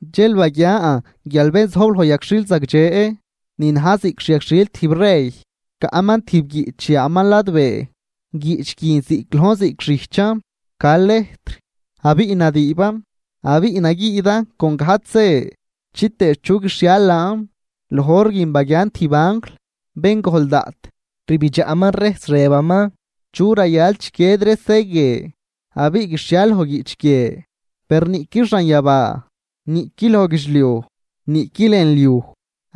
Dxel baguian guial bén zojb loj yagxhil zagdxe ni na̱j ziꞌc xyagxhil tijb rey, caꞌman tijb guiꞌch yaaman ladbee. Guiꞌch guin ziꞌc lojn ziꞌc xijchan ca lejtr abiꞌ nadüüban, abiꞌ naguiidan con gajdx se chitëë chu guixhial laan. Loj hor guin baguian tijb anjl bén gojl daꞌt, rbidxaꞌman rejs rëbaman: ―¿Chu rayal chiquied ree se guie abiꞌ guixhial loj guiꞌch guie? Per niꞌqui xanyabaa, niꞌqui loj guidxliuj, niꞌqui lën liuj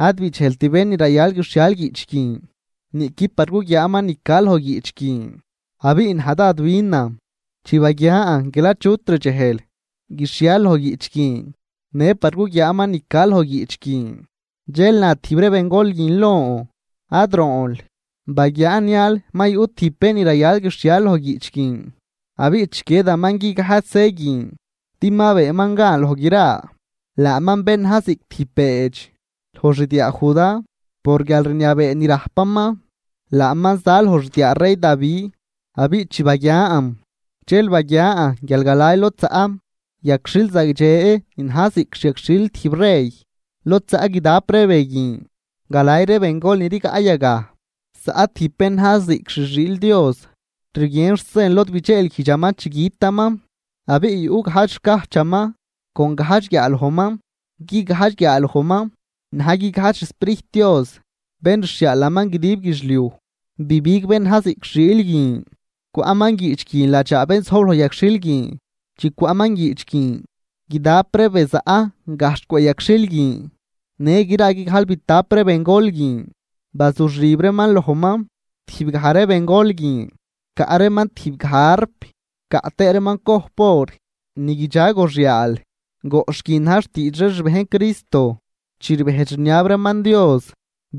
ad bidxejlt bén ni rayal guixhial guiꞌch guin, niꞌqui par guguiaaman ni ca loj guiꞌch guin. Abiꞌ naj dád binan chi baguian guial achut rdxejl guixhial loj guiꞌch guin në par guguiaaman ni ca loj guiꞌch guin. Dxel na tijb ree bengol guin lon: ―Ad roonl, baguiaa nial ma yuꞌ tijb bén ni rayal guixhial loj guiꞌch guin abiꞌ chiquiedaman guigajdx se guin din ma beenman gan loj gra, laaman bén na̱j ziꞌc tijb beedx loj xdiaa Judá por guialrniabee ni rajpaman, laaman za loj xdiaa rey Davi. Abiꞌ chi baguian, dxel baguian guial galay lod zaꞌ yagxhil zagdxe ni na̱j ziꞌc xyagxhil tijb rey, lod zaꞌ guidap ree be guin galay ree bengol ni rigaꞌ yagaj, zaꞌ tijb bén na̱j ziꞌc xi xiil Dios rguien xsen lod bidxeelguijdxaman chi gütaman. Abiꞌ yuꞌ gajdx xcajchaman con gajdx guiaalojman, guigajdx guiaalojman na̱j guigajdx xSprijt Dios bén rxhiaalaman guidib guidxliuj. Bibig bén na̱j ziꞌc xiil guin cwaꞌman guiꞌch guin ladxaa bén zojb loj yagxhil guin. Chi cwaꞌman guiꞌch guin, guidap ree be zaꞌ gajxh cwëꞌ yagxhil guin në gra guigajlbitap ree bengol guin bazuxib reeman lojman. Tijb gaj ree bengol guin caꞌ reeman tijb gaj arp caꞌ tëë reeman cojp or ni guidxa goxyaal, goꞌxh guin na̱j xtiidx ree xbejn Cristo chi rbejdx rniab reeman Dios.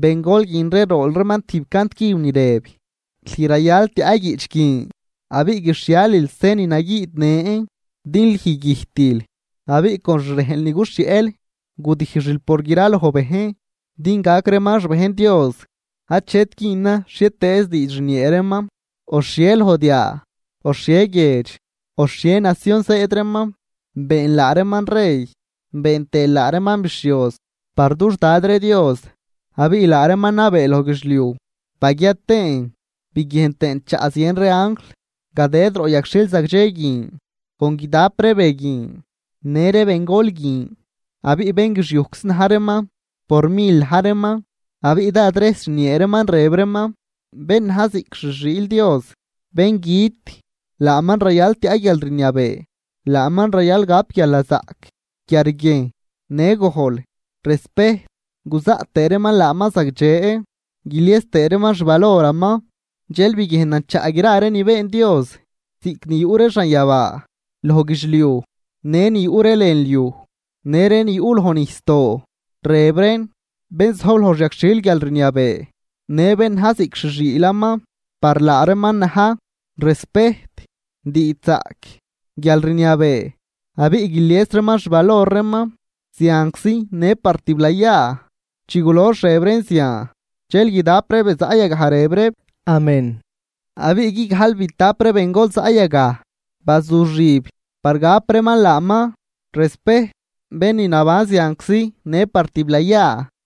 Bengol guin ree rool reeman tijb cant cüb ni rëb: Lüj rayal tiaꞌ guiꞌch guin abiꞌ guixhialil se ni naguiidnën. Din lüj güjtil abiꞌ con xrejnl ni guxhieꞌl gudijxil por graloj bejn din gac reeman xbejn Dios, achet güünan xhietëëz diidx rniee reeman, o xhie loj diaa, o xhie guiedx o xhie nacion zëëd reeman. Beenl laa reeman rey been tëël laa reeman bixhioz par dux Dad ree Dios, abiꞌ laa reeman nabee loj guidxliuj. Baguia tëën biguiejn tëën chaꞌ zien ree anjl gadëd roꞌ yagxhil zagdxe guin con guidap ree be guin në ree bengol guin. Abiꞌ bénguixiujczi na̱j reeman por mil na̱j reeman. Abiꞌ dád rejs rniee reeman rëb reeman: Bén na̱j ziꞌc xi xiil Dios, bén güt, laaman rayal tiaꞌ guialrniabee, laaman rayal gap guialnazaꞌc, quiarguiejn, në gojl, respejt, guzaꞌt reeman laaman zagdxe, guilies tëë reeman xvaloraman. Dxel biguiejnan chaꞌ gra ree ni been Dios, ziꞌc ni yuꞌ ree xanyabaa, loj guidxliuj në ni yuꞌ ree lën liuj në ree ni yuꞌ loj nijsdoo, rëb reen: Bén zojb loj xyagxhil guialrniabee në bén na̱j ziꞌc xi xiilaman, par laa reeman na̱j respejt, diidxzaꞌc, guialrniabee, abiꞌ guilies reeman xvalor reeman zianczi në par tiblayaa. Chi gulox rëb reen zian, dxel guidap ree be zaꞌ yagaj rëb reeb: ―Amén. Abiꞌ guigajlbitap ree bengol zaꞌ yagaj bazuxib par gap reeman laaman respejt, bén ni naban zianczi në par tiblayaa.